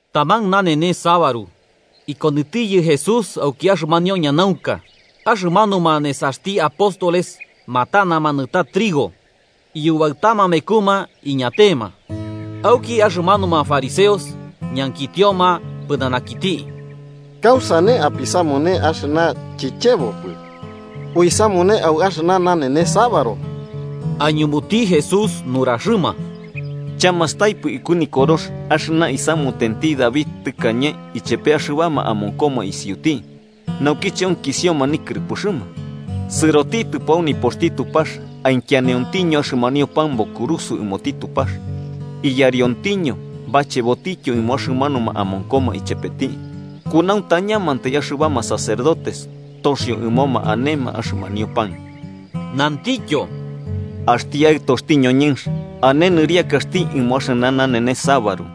Taman nanenes sabaru, ikonɨtiyɨ Jesús auki axɨmanio ñanaunka. Axɨmanuma nesaxti apóstoles matanama nɨta trigo, iyubaɨtama mekuma iñatema. Auki axɨmanuma fariseos ñankitioma pɨnanakiti: –¿Kausane apisamune axɨna chichebopɨ uisamune au axɨna nanenes sabaru? Aiñumuti Jesús nuraxɨma: –¿Chamastaipɨ iku nikorox axɨna isamutenti David tɨkañe ichepe axɨbama amonkoma isiuti naukiche onkisioma nikɨrɨpɨxɨma? Sɨrotitɨpo au nipoxti Tupax, ikianiontiño axɨmanio pan bokurusɨo ɨmoti Tupax, iyariontiño bachebotityo ɨmo axɨmanuma amonkoma ichepeti, kunauntañamantai axɨbama sacerdotes toxio ɨmoma anema axɨmanio pan. Nantityo: –Axti Aɨtoxti ñoñɨnx ane nɨriakaxti ɨmo axɨna nanenes sabaru.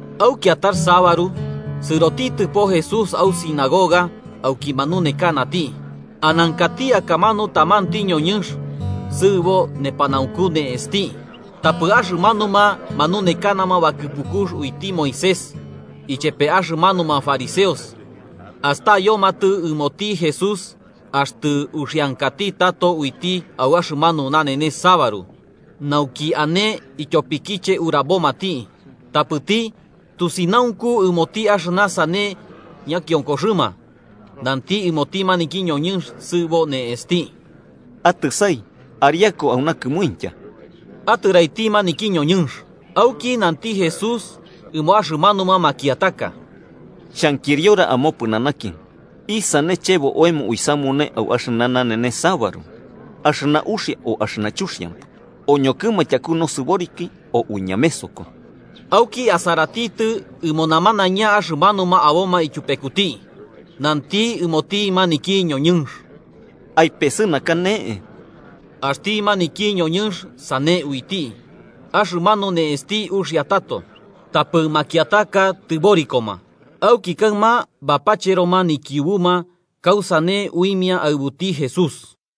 Au kiatax sabaru, sɨrotitɨpo Jesús au sinagoga auki manunekanati. Anankati akamanu tamanti ñoñɨnx sɨɨbo nepanaunku ne'esti. Tapɨ axɨmanuma manunekana bakɨpukux uiti Moisés ichepe axɨmanuma fariseos astayomatɨ ɨmoti Jesús axtɨ uxiankati tato uiti au axɨmanu nanenes sabaru, nauki ane ityopikiche urabomati. Tapɨti, tusinaunku ɨmoti axɨna sane ñakionkoxɨma, nanti ɨmoti maniki ñoñɨnx sɨɨbo ne'esti: –Atɨsai ariaku auna kɨmuintya. Atɨraiti maniki ñoñɨnx, auki nanti Jesús ɨmo axɨmanuma makiataka: –Xhankiriora amopɨnanaki: ¿Isane chebo oemo uisamune au axɨna nanenes sabaru: axɨna uxia o axɨna chuxiampɨ? ¿Oñokɨma tyaku nosɨboriki o uiñamesoko? Auki asaratitɨ ɨmo namanaiña axɨmanuma aboma ityupekuti, nanti ɨmoti maniki ñoñɨnx: –Aipesɨnaka ne'e. Axti maniki ñoñɨnx sane uiti, axɨmanu ne'esti uxia tato. Tapɨ makiataka tɨborikoma auki kaɨma bapacheroma nikiubuma kausane uimia aɨbuti Jesús.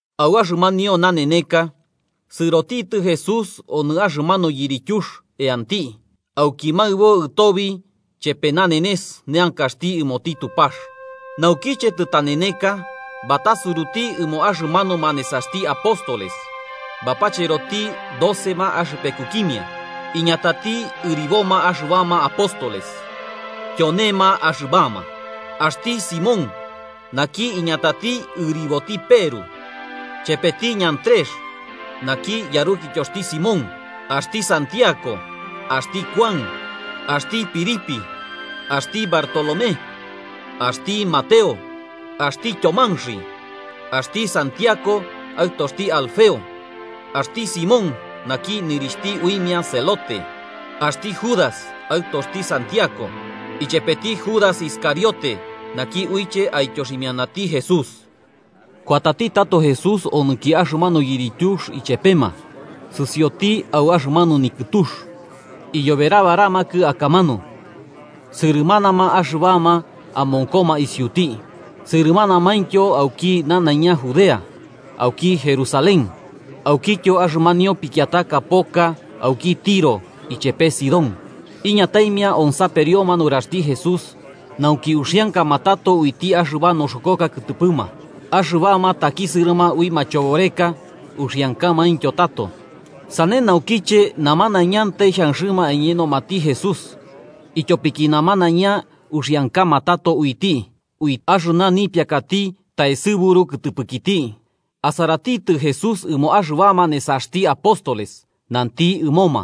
Au axɨmanio naneneka, sɨrotitɨ Jesús onɨ axɨmanu yirityux eanti, auki maɨbo ɨtobi chepe nanenes neankaxti ɨmoti Tupax. Naukiche tɨtaneneka, batasuruti ɨmo axɨmanuma nesaxti apóstoles, bapacheroti docema axɨpekukimia, iñatati ɨriboma axɨbama apóstoles. Tyonema axɨbama: axti Simón, naki iñatati ɨriboti Peru. Chepeti Andrés naki, yarukityoxti Simón. Axti Santiago, axti Kuan, axti Felipe, axti Bartolomé, axti Mateo, axti Tyomanxi, axti Santiago, aɨtoxti Alfeo. Axti Simón, naki nɨrixhti uimia celote, axti Judas, aɨtoxti Santiago, ichepeti Judas Iscariote, naki uiche aityoximianati Jesús. Kuatati tato Jesús onɨki axɨmanu yirityux ichepema sɨsioti au axɨmanu nikɨtux. Iyoberabaramakɨ akamanu sɨrɨmanama axɨbama amonkoma isiuti sɨrɨmanamaintyo auki nanaiña Judea, auki Jerusalén aukityo axɨmanio pikiataka poka auki Tiro ichepe Sidón. Iñataimia onsaperioma nuraxti Jesús nauki uxiankama tato uiti axɨba noxokoka kɨtɨpɨma. Axɨbama takisɨrɨma ui machoboreka, uxiankamaintyo tato. Sane naukiche namanaiñantai xhanxɨma aiñenomati Jesús, ityopiki namanaiña uxiankama tato uiti ui axɨna nipiakati taesɨburu kɨtɨpɨkiti. Asaratitɨ Jesús ɨmo axɨbama nesaxti apóstoles, nanti ɨmoma: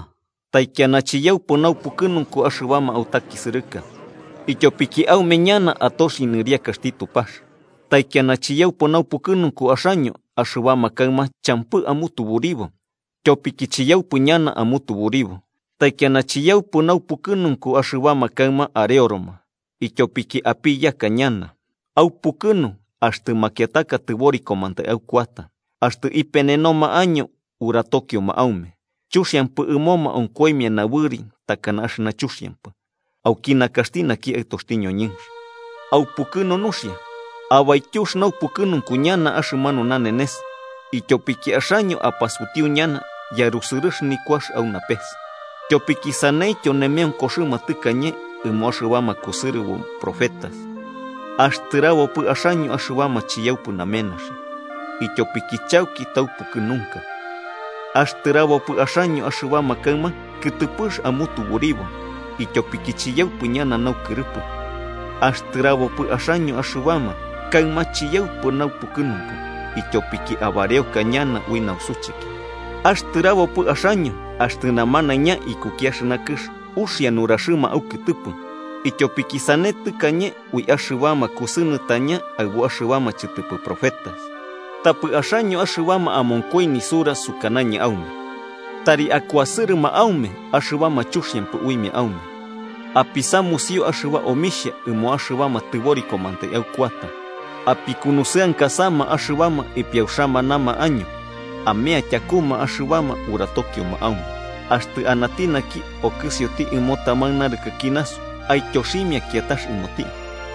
“Taikiana chiyaupɨ naupukɨnunku axɨbama autakisɨrɨka, ityopiki aume ñana atoxi nɨriakaxti Tupax. “Taikiana chiyaupɨ naupukɨnunku axaño axɨbama kaɨma champɨ amutuburibo, tyopiki chiyaupɨ ñana amutuburibo. “Taikiana chiyaupɨ naupukɨnunku axɨbama kaɨma areoroma, ityopiki apiyaka ñana. Aupukɨnu axtɨ makiataka tɨborikomantai aukuata, axtɨ ipenenoma año, uratokioma aume, chuxiampɨ ɨmoma onkoimia nabɨri takana axɨna chuxiampɨ, auki nakaxti naki Aɨtoxti ñoñɨnx. Aupukɨnu nuxia, abaityux naupukɨnunku ñana axɨmanu nanenes, ityopiki axaño apasutiu ñana yarusɨrɨx nikuax au napes. Tyopiki saneityo nemeonkoxɨma tɨkañe ɨmo axɨbama kusɨrɨbo profetas. “¡Axtɨrabopɨ axaño axɨbama chiyaupɨ namenaxi, ityopiki chauki taupukɨnunka! “¡Axtɨrabopɨ axaño axɨbama kaɨma kɨtɨpɨx amutuburibo, ityopiki chiyaupɨ ñana naukɨrɨpɨ! “¡Axtɨrabopɨ axaño axɨbama kaɨma chiyaupɨ naupukɨnunku, ityopiki abareoka ñana ui nausucheki! “¡Axtɨrabopɨ axaño axtɨ namanaiña ikuki axɨna kɨx uxia nuraxɨma aukɨtɨpɨ, ityopiki sane tɨkañe ui axɨbama kusɨnɨtañama aɨbuma axɨbama chɨtɨpɨ profetas! “Tapɨ axaño axɨbama amonkoi nisura sukanañɨ aume: Tari akuasɨrɨma aume axɨbama chuxiampɨ uimia aume, apisamusio axɨba omixhia ɨmo axɨbama tɨborikomantai aukuata, apikunusɨankasama axɨbama ipiauxamanama año, amea tyakuma axɨbama uratokioma aume. Axtɨ anati naki okɨsioti ɨmo taman narɨkɨki nasu, aityoximia kiatax ɨmoti.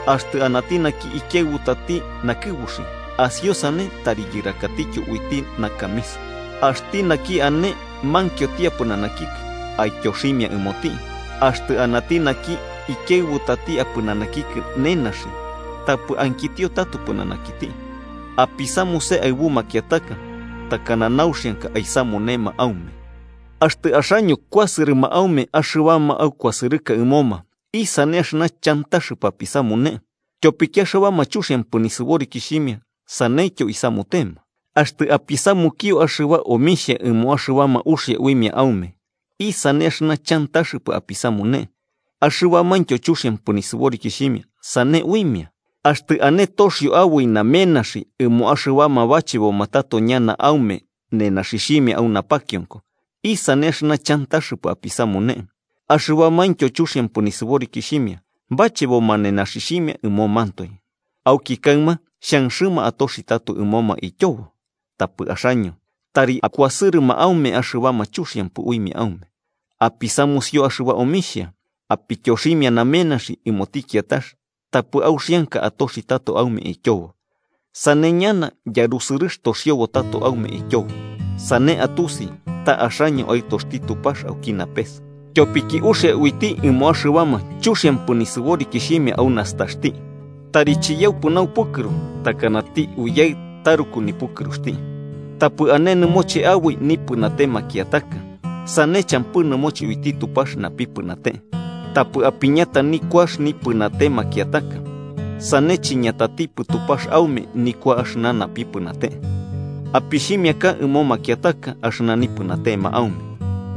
Axtɨ anati naki ikiaɨbutati nakɨbuxi, asiosane tari yɨrakatityo uiti nakamisa. Axti naki ane mankioti apɨnanakikɨ, aityoximia ɨmoti, axtɨ anati naki ikiaɨbutati apɨnanakikɨ nenaxi, tapɨ ankitio tato pɨnanakiti. Apisamuse aɨbu makiataka takana nauxianka aisamunema aume. “Axtɨ axaño kuasɨrɨma aume axɨbama aukuasɨrɨka ɨmoma, ¿isane axɨna chantaxɨpɨ apisamune? Tyopiki axɨbama chuxiampɨ nisɨborikixhimia saneityo isamutema. Axtɨ apisamukio axɨba omixhia ɨmo axɨbama uxia uimia aume, ¿isane axɨna chantaxɨpɨ apisamune? Axɨbamaintyo chuxiampɨ nisɨborikixhimia sane uimia. Axtɨ ane toxio aboi namenaxi ɨmo axɨbama bacheboma tato ñana aume nenaxixhimia au napakionko, ¿isane axɨna chantaxɨpɨ apisamune? Axɨbamaintyo chuxiampɨ nisɨborikixhimia bacheboma nenaxixhimia ɨmomantoe, auki kaɨma xhanxɨma atoxi tato ɨmoma ityobo. Tapɨ axaño tari akuasɨrɨma aume axɨbama chuxiampɨ uimia aume, apisamusio axɨba omixhia, apityoximia namenaxi ɨmoti kiatax tapɨ auxianka atoxi tato aume ityobo. Sane ñana yarusɨrɨx toxiobo tato aume ityobo, sane atusi ta axaño aɨtoxti Tupax auki napes, tyopiki uxia uiti ɨmo axɨbama chuxiampɨ nisɨborikixhimia au nastaxti. Tari chiyaupɨ naupukɨru, takanati Uyaɨ taruku nipukɨruxti. “Tapɨ ane nɨmoche aboi nipɨnate makiataka, sane champɨ nɨmoche uiti Tupax napipɨnate. Tapɨ apiñata nikuax nipɨnate makiataka, sane chiñatatipɨ Tupax aume nikua axɨna napipɨnate. Apixhimiaka ɨmo makiataka axɨna nipɨnatema aume,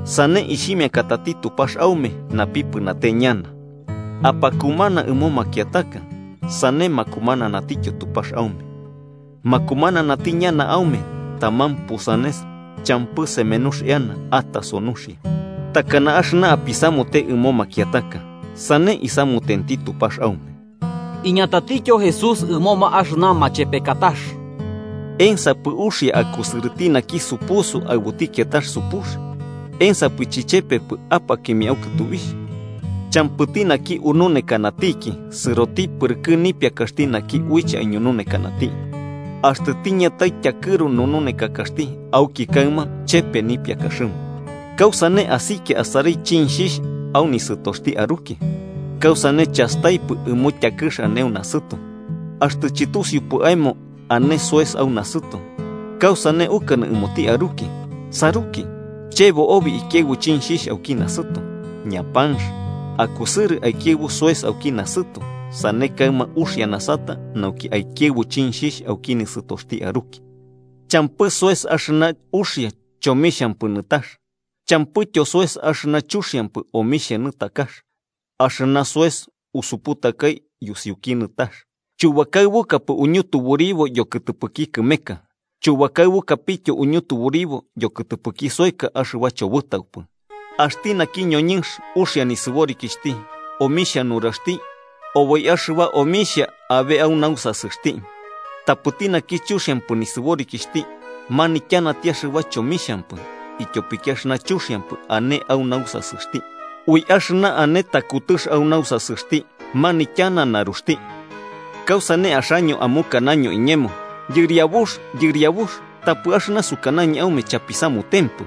sane ixhimiakatati Tupax aume napipɨnate ñana. Apakumana ɨmo makiataka, sane makumananatityo Tupax aume. Makumananati ñana aume taman pusanes, champɨ semenux eana ataso nuxia. Takana axɨna apisamute ɨmo makiataka, sane isamutenti Tupax aume.” Iñatatityo Jesús ɨmoma axɨna machepekatax: “¿Ensapɨ uxia akusɨrɨti naki supusu aɨbuti kiatax supux? ¿Ensapɨ chichepepɨ apakimia au kɨtubixh? Champɨti naki ununekanatiki sɨroti pɨrɨkɨ nipiakaxti naki uiche aiñununekanati: axtɨ tiñatai tyakɨru nununekakaxti auki kaɨma chepe nipiakaxɨma. ¿Kausane asikia asarai chinxhixh au nisɨtoxti aruki, kausane chasakapɨtɨ ɨmo tyakɨx ane au nasɨto? Axtɨ chɨtusiupɨ aemo ane soes au nasɨto, ¿kausane ukanɨ ɨmoti aruki: ‘Saruki, chebo obi ikiaɨbu chinxhixh auki nasɨto’? ¡Ñapanx!, akusɨrɨ aikiaɨbu soes auki nasɨto, sane kaɨma uxia nasata nauki aikiaɨbu chinxhixh auki nisɨtoxti aruki. “Champɨ soes axɨna uxia chomixhampɨ nɨtax, champɨityo soes axɨna chuxiampɨ omixhia nɨtakax. Axɨna soes usuputakai yusiuki nɨtax: chubakaɨbukapɨ uñutuburibo yokɨtɨpɨki kɨmeka, chubakaɨbukapityo uñutuburibo yokɨtɨpɨki soeka axɨba chobɨtaupɨ. Axti naki ñoñɨnx uxia nisɨborikixhti omixhia nuraxti oboi axɨba omixhia abe au nausasɨxti, tapɨti naki chuxiampɨ nisɨborikixhti manityanati axɨba chomixhampɨ ityopiki axɨna chuxiampɨ ane au nausasɨxti. Ui axɨna ane takutɨx au nausasɨxti manityana naruxti. “¿Kausane axaño amukanaño iñemo, ‘Yɨriabux, Yɨriabux’, tapɨ axɨna sukanañɨ aume chapisamutempɨ?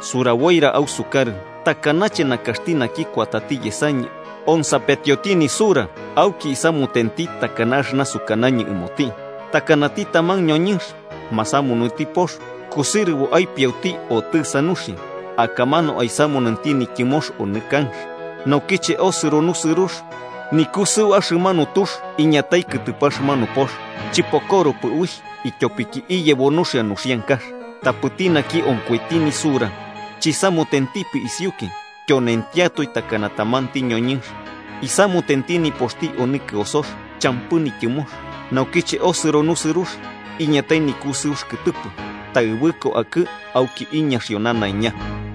Suraboira ausukarɨ takanache nakaxti naki kuatati yesañɨ onsapetioti nisura, auki isamutenti takana axɨna sukanañɨ ɨmoti: Takanati taman ñoñɨnx masamunuti pox kusɨrɨbo aipiauti otɨsa nuxia, akamanu aisamunenti nityɨmox onɨ kanx. Naukiche osɨro nusɨrux, nikusɨu axɨmanu tux iñatai kɨtɨpɨ axɨmanu pox, chɨpokoropɨ uixh, ityopiki iyebo nuxia nuxiankax. Tapɨti naki onkoiti nisura chisamutentipɨ isiuki, tyonentiatoe takana tamanti ñoñɨnx isamutenti nipoxti onɨ kɨosox champɨ nityɨmox. Naukiche osɨro nusɨrux iñatai nikusɨux kɨtɨpɨ, taɨbɨko akɨ auki iñaxio nanaiña.”